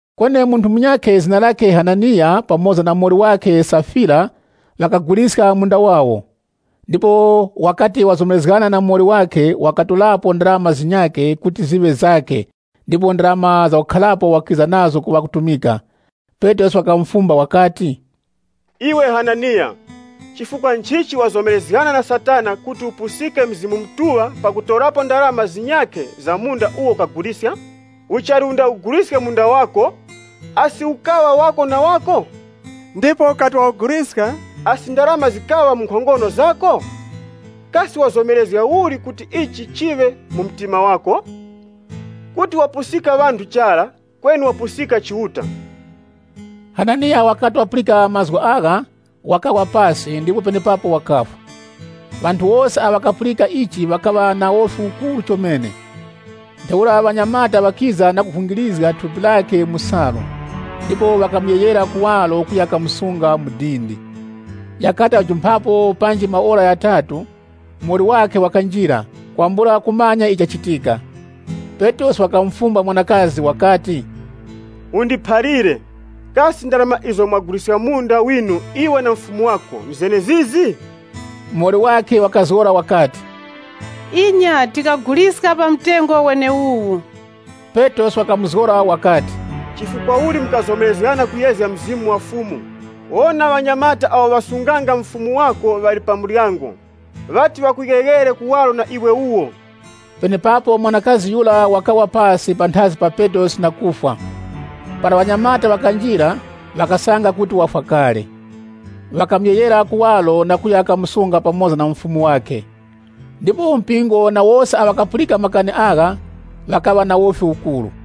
Kweni munthu munyakhe zina lakhe Hananiya pamoza na muwoli wakhe Safira ŵakaguliska munda wawo, ndipo wakati wazomerezgana na muwoli wakhe, wakatorapo ndarama zinyakhe kuti ziŵe zakhe ndipo ndarama zakukharako wakiza nazo ku ŵakutumika. Petrosi wakamufumba wakati, “Iwe Hananiya, chifukwa nchichi wazomerezgana na Satana kuti upusike Mzimu Mutuŵa pakutorapo ndarama zinyakhe za munda uwo ukaguliska? Uchali undawuguliske munda wako, asi ukaŵa wako na wako? Ndipo ukati wawuguliska, asi ndarama zikaŵa mu nkhongono zako? Kasi wazomerezga uli kuti ichi chiŵe mu mtima wako? Kuti wapusika ŵanthu chara, kweni wapusika Chiuta.” Hananiya wakati wapulika mazgu agha, wakawa pasi ndipo penepapo wakafwa. Ŵanthu wose awo ŵakapulika ichi ŵakaŵa na wofi ukuru chomene. Ntheura ŵanyamata ŵakiza na kuvungirizga thupi lakhe mu salu, ndipo ŵakamuyeghera kuwaro kuya kamusunga mu dindi. Ghakati ghajumphapo panji maora ghatatu, muwoli wakhe wakanjira, kwambula kumanya icho chachitika. Petrosi wakamufumba mwanakazi wakati, “Undiphalire, kasi ndarama izo mwaguliska munda winu, iwe na mufumu wako, nzenezizi?” Muwoli wakhe wakazgora wakati, “Inya tikaguliska pa mtengo weneuwu.” Petrosi wakamuzgora wakati, “Chifukwa uli mukazomerezgana kuyezga Mzimu wa Fumu? Wona ŵanyamata awo ŵasunganga mufumu wako ŵali pa muryango, ŵati ŵakuyeghere kuwaro na iwe wuwo!” Penepapo mwanakazi yura wakawa pasi panthazi pa Petrosi na kufwa. Para ŵanyamata ŵakanjira, ŵakasanga kuti wafwa kale. Ŵakamuyeghera kuwaro na kuya kamusunga pamoza na mufumu wakhe. Ndipo mpingo na wose awo ŵakapulika makani agha, ŵakaŵa na wofi ukuru.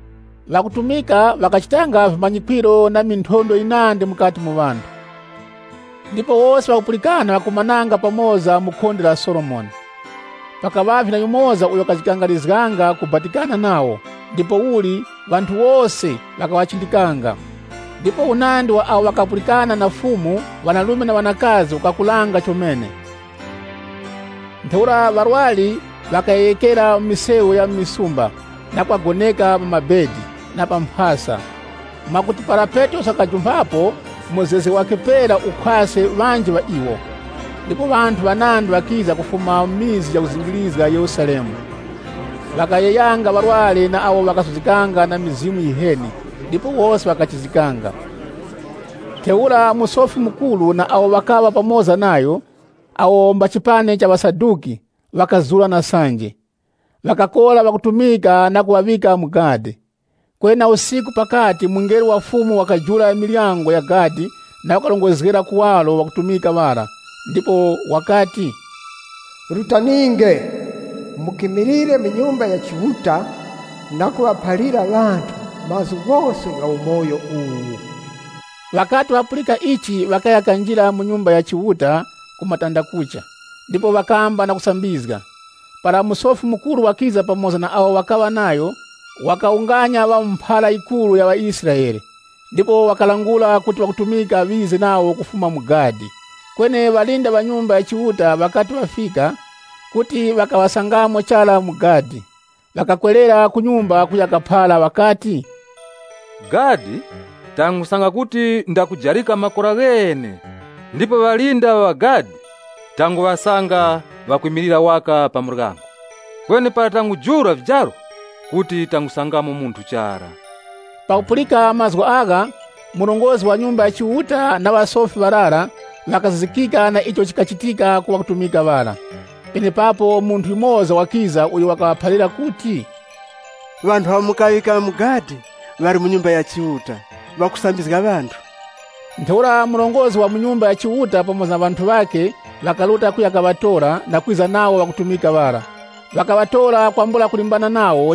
Ŵakutumika ŵakachitanga vimanyikwiro na minthondwe yinandi mukati mu ŵanthu. Ndipo wose ŵakupulikana ŵakakumananga pamoza mu khonde la Solomoni. Pakaŵavye na yumoza uyo wakajikangarizga kubatikana nawo, ndipouli ŵanthu wose ŵakaŵachindikanga. Ndipo unandi wa awo ŵakapulikana na Fumu, ŵanarume na ŵanakazi ukakuranga chomene. Ntheura ŵarwari ŵakayeghekera mu misewu ya mu misumba, na kuŵagoneka pa vitara na pa mphasa, mwakuti para Petrosi wakujumphapo muzgezge wakhe pera ukhwaske ŵanji ŵa iwo. Ndipo ŵanthu ŵanandi ŵakiza kufuma mu mizi yakuzingirizga Yerusalemu. Ŵakayeghanga ŵarwari na awo ŵakasuzgikanga na mizimu yiheni ndipo wose ŵakachizgikanga. Ntheura Musofi Mukuru na awo ŵakaŵa pamoza nayo, awo mba chipani cha Ŵasaduki, ŵakazura na sanje. Ŵakakora ŵakutumika na kuŵaŵika mu gadi. Kweni na usiku pakati mungelo wa Fumu wakajula miryango ya gadi na kuŵarongozgera kuwaro ŵakutumika ŵara, ndipo wakati, “Rutaninge, mukimilire mu Nyumba ya Chiuta na kuŵaphalira ŵanthu mazgu ghose gha umoyo uwu.” Ŵakati ŵapulika ichi, ŵakaya kanjira mu Nyumba ya Chiuta ku matandakucha, ndipo ŵakamba kusambizga. Para Musofi Mukuru wakiza pamoza na awo ŵakaŵa nayo, wakawunganya ŵa mu mphara yikuruya ŵaIsraele, ndipo ŵakalangula kuti ŵakutumika ŵize nawo kufuma ku gadi. Kweni ŵalinda ŵa Nyumba ya Chiuta ŵakati ŵafika, kuti ŵakaŵasangamo chara mu gadi. Ŵakawerera kunyuma kuya kaphara, ŵakati, “Gadi, tangusanga kuti ndakujarika makora ghene, ndipo ŵalinda ŵa gadi tanguŵasanga ŵakwimilira waka pa muryango. Kweni para tangujula vijaro kuti tangusangamo munthu chara.” Pakupulika mazgu agha, murongozgi wa Nyumba ya Chiuta, na ŵasofi ŵarara ŵakazizikika na icho chikachitika ku ŵakutumika ŵara. Penepapo munthu yumoza wakiza uyo wakaŵaphalira kuti, “Ŵanthu awo mukaŵika mu gadi ŵali mu Nyumba ya Chiuta ŵakusambizga ŵanthu.” Ntheura murongozgi wa mu Nyumba ya Chiuta pamoza na ŵanthu ŵakhe ŵakaruta kuya kaŵatora, kwambula kulimbana nawo, na kwiza nawo ŵakutumika ŵara,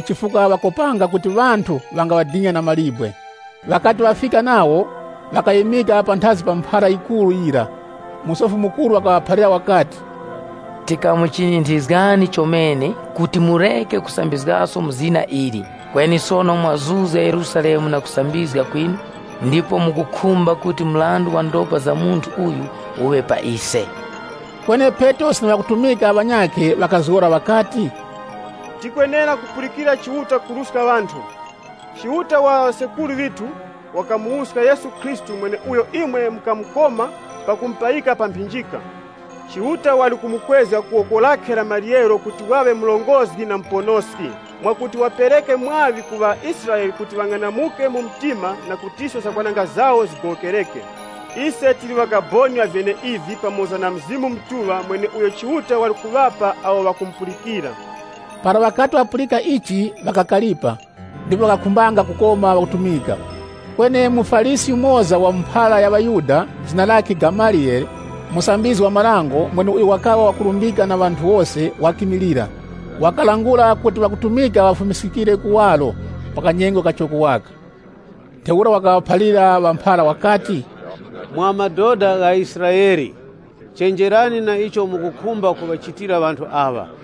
chifukwa ŵakopanga kuti ŵanthu ŵangaŵadina na mawe. Ŵakati ŵafika nawo, ŵakaŵimika panthazi pa mphara yikuruyira. Musofi Mukuru wakaŵaphalira wakati, “Tikamuchinyinthizgani chomene kuti mureke kusambizgaso mu zina ili, kweni sono mwazuzga Yerusalemu na kusambizga kwinu, ndipo mukukhumba kuti mrandu wa ndopa za munthu uyu uŵe pa ise.” Kweni Petrosi na ŵakutumika ŵanyakhe ŵakazgora ŵakati, “Tikwenera kupulikira Chiuta kuruska ŵanthu! Chiuta wa ŵa sekuru ŵithu wakamuwuska Yesu mweneuyo imwe mukamukoma pakumupayika pa mphinjika. Chiuta wali kumukwezga ku woko lakhe la maryero kuti waŵe Murongozgi na Muponoski, mwakuti wapereke mwaŵi ku ŵaIsraele kuti ŵang'anamuke mu mtima na kutiso zakwananga zawo zigowokereke. Ise tili ŵakaboni ŵa vyeneivi pamoza na Mzimu Mutuŵa mweneuyo Chiuta wali kuŵapa awo ŵakumupulikira.” Para ŵakati ŵapulika ichi, ŵakakaripa, ndipo ŵakakhumba kukoma ŵakutumika. Kweni muFarisi yumoza wa mu mphara ya ŵaYuda zina lakhe Gamaliyele, mumanyi-marango, mweneuyo wakaŵa wakurumbika na ŵanthu wose, wakimilira. Wakalangula kuti ŵakutumika ŵafumiskikire kuwaro pa kanyengo kachoko waka. Ntheura wakaŵaphalira ŵa mphara wakati, “Mwa madoda gha Israele, chenjerani na icho mukukhumba kuŵachitira ŵanthu aŵa.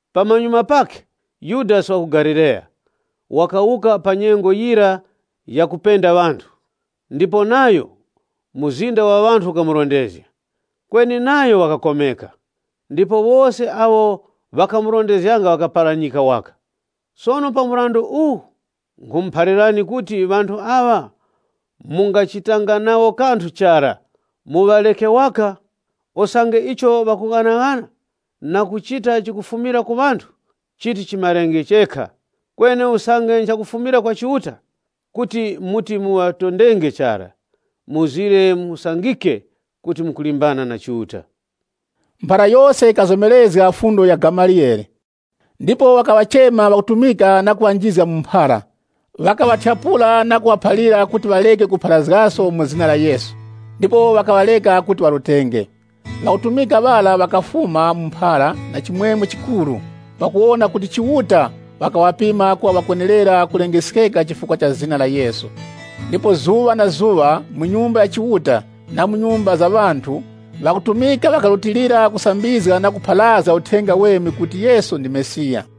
Pamanyuma pakhe, Yudasi wa ku Galileya, wakawuka pa nyengo yira yakupenda ŵanthu, ndipo nayo, mzinda wa ŵanthu ukamurondezga. Kweni nayo wakakomeka, ndipo wose awo ŵakamurondezganga ŵakaparanyika waka. Sono pa mrandu uwu nkhumuphalirani kuti ŵanthu aŵa mungachitanga nawo kanthu chara, muŵareke waka. Usange icho ŵakughanaghana na kuchita chikufumira ku ŵanthu, chiti chimarenge chekha. Kweni usange nchakufumira kwa Chiuta, kuti muti muŵatondenge chara, musangike kuti mukulimbana na Chiuta.” Mphara yose yikazomerezga fundo ya Gamaliyele Ndipo wakaŵachema ŵakutumika na kuŵanjizga mu mphara, ŵakaŵathyapula na kuŵaphalira kuti ŵareke kupharazgaso mu zina la Yesu. Ndipo ŵakaŵareka kuti ŵarutenge. Ŵakutumika ŵara ŵakafuma mu mphara na chimwemwe chikuru, pakuwona kuti Chiuta wakaŵapima kuŵa ŵakwenerera kulengeskeka chifukwa cha zina la Yesu. Ndipo zuŵa na zuŵa mu Nyumba ya Chiuta, na mu nyumba za ŵanthu, ŵakutumika ŵakarutilira kusambizga na kupharazga Uthenga Uweme kuti Yesu ndi Mesiya.